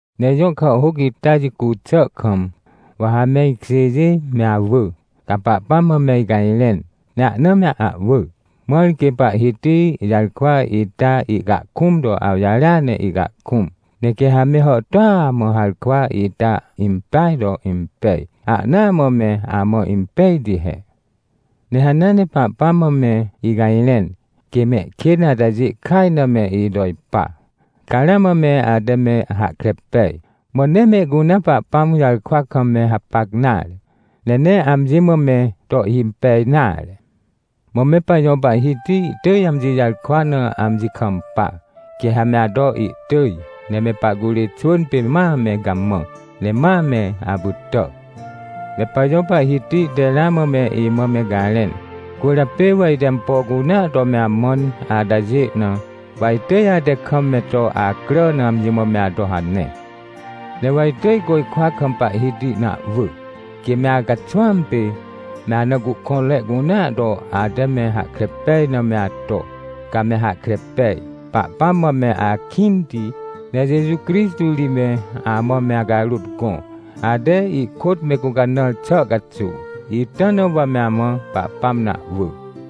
Ne ijõ kàhhôc ita jicu xà kam, wa ha me ikjêjê me awỳ, ca Pahpãm mã me icajrẽn. Ne ahna me ahwỳ, mãr quê Pahhiti jarkwa ita ihcahkũm to awjarêa ne ihcahkũm. Ne quê ha me hàhtôa mã harkwa ita impeaj to impej, ahnaa mã me amã impejti he. Ne hanea ne Pahpãm mã me icajrẽn, quê mehkên atajê kaj na me ito ipa. Ca ramã me ate me hahkre pej, mã nee mehcunea Pahpãm jarkwa kam me hapac nare, ne nee amji mã me to ihhimpej nare. Mã me pajõ Pahhiti ihtỳj amji jarkwa na amji kampa. Quê ha me ato ihtỳj, ne me pahcurê xwỳn pê ma me gamã, ne ma me apytà. Me pajõ Pahhiti te ramã me imã me garẽn, cwỳrjapê wa ite ampo cunea to me amãn atajê na, wa itỳj ate kam me to acrà na amji mã me ato hane. Ne wa itỳj côjkwa kam Pahhiti na ahwỳ, quê me acaxwãam pê, me ana cuhkõnre cunea to ate me hahkre pej na me ato, ca me hahkre pej. Pahpãm mã me akĩnti, ne Jeju Crixtô ri me amã me acarôt gõ, ate ihkôt me gũcanãr xà caxuw. Ita na wa me amã Pahpãm na ahwỳ.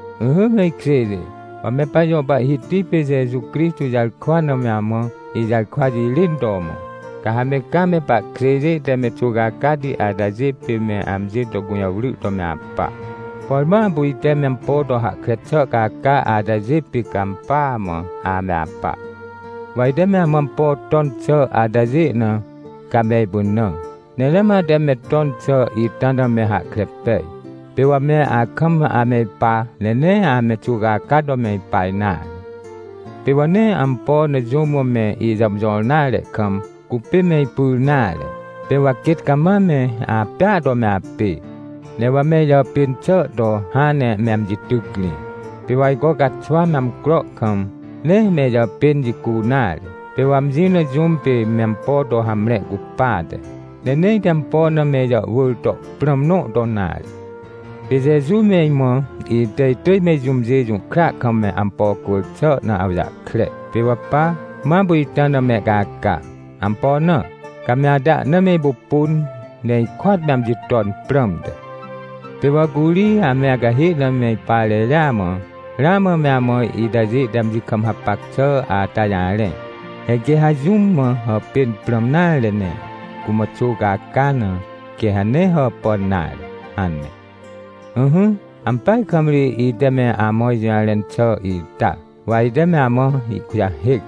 Ỹhỹ me ikjêjê, wa me pajõ Pahhiti pê Jeju Crixtô jarkwa na me amã ijarkwa jirên to mõ. Ca ha me caa me pahkjêjê te me xuwcacati atajê pê me amji to gũjawry to me apa. Por ma apu ite me ampo to hahkre xà caca atajê pê ca ampỳa mã ame apa. Wa ite me amã ampo ton xà atajê na, ca me ipynã. Ne ramã ate me ton xà ita na me hahkre pej. Pê wa me akam ame ipa, ne nee ame xuwcaca to me ipa nare. Pê wa nee ampo na jũm mã me ijàmjõr nare kam, cupê me ipyr nare. Pê wa quêt cama me apêa to me apê, ne wa me ijàpên xà to hãn ne me amji tycrĩ. Pê wa ajco caxwa me amcro kam, nee me ijàpên jicu nare, pê wa amji na jũm pê me ampo to hamre cupate. Ne nee ite ampo na me ijàhwỳr to prãm nõ to nare. Pê Jeju me imã ite itỳj me jũmjê jũhkra kam me ampo cwỳr xà na awjahkre. Pê wa pa, ma apu ita na mehcaca. Ampo na? Ca me ate ahna me ipupun, ne ikôat me amji ton prãmte. Pê wa curi ame acahê na me ipa reria mã, ramã me amã itajê te amji kam hapac xà ata jarẽ: — He quê ha jũm mã hàpên prãm nare ne cumã xuwcaca na, quê ha nee hàpàn nare — hane. Ỹhỹ, ampeaj kam ri ite me amã ijũjarẽn xà ita, wa ite me amã ihkujahêc.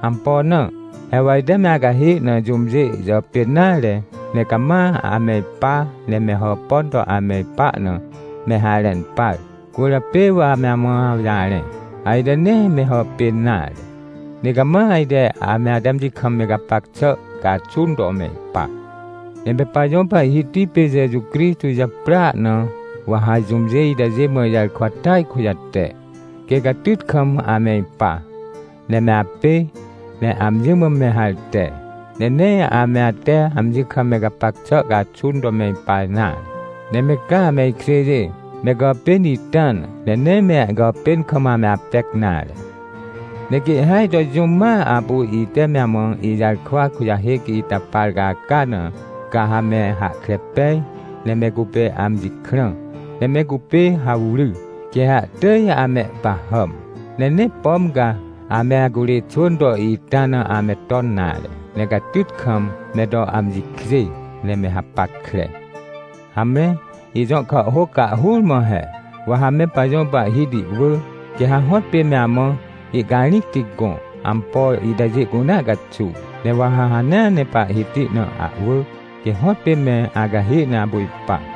Ampo na? He wa ite me acahê na jũmjê jàpên nare, ne cama ame ipa ne me hàpàn to ame ipa na, me harẽn par. Cwỳrjapê wa ame amã awjarẽ. Ajte nee me hàpên nare, ne cama ajte ame ate amji kam me gapac xà caxun to me ipa. Ne me pajõ Pahhiti pê Jeju Crixtô japrỳa na wa ha jũmjê itajê mã ijarkwa tỳaj kujate, quê catyt kam ame ipa, ne me apê, ne amji mã me harte. Ne nee ame ate amji kam me gapac xà caxun to me ipa nare. Ne me ca me ikjêjê, me gàpên ita na, ne nee me gàpên kam ame apec nare. Ne quê ihhêaj to jũm ma apu ite me amã ijarkwa kujahêc ita par caca na, ca ha me hahkre pej ne me cupê amji krã, ne me cupê hawry, quê ha ihtỳj amehpahàm. Ne nee pom ca ame acurê xwỳn to ita na ame ton nare, ne catyt kam me to amji kjê, ne me hapackre. Hamre, ijõ kàhhôc cahhur mã he. Wa ha me pajõ Pahhiti wỳ, quê ha hõtpê me amã ihcarĩcti gõ, ampo itajê cunea caxuw. Ne wa ha hanea ne Pahhiti na ahwỳ, quê hõtpê me acahê na apu ipa.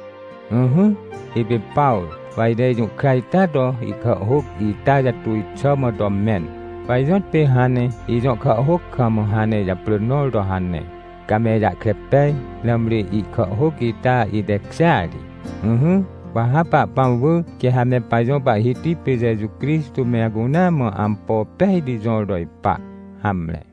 Ỹhỹ, ipê Pawrô, wa ite ijũhkra ita to ihkàhhôc ita jatuj xà mã to mẽn. Wa ijõtpê hãn ne ijõ kàhhôc kam hãn ne ijaprỳ nõr to hane, ca me ijahkre pej, nãmri ihkàhhôc ita itekjêa ri. Ỹhỹ, wa ha Pahpãm wỳ, quê ha me pajõ Pahhiti pê Jeju Crixtô me acunea mã ampo pejti jõr to ipa. Hamre.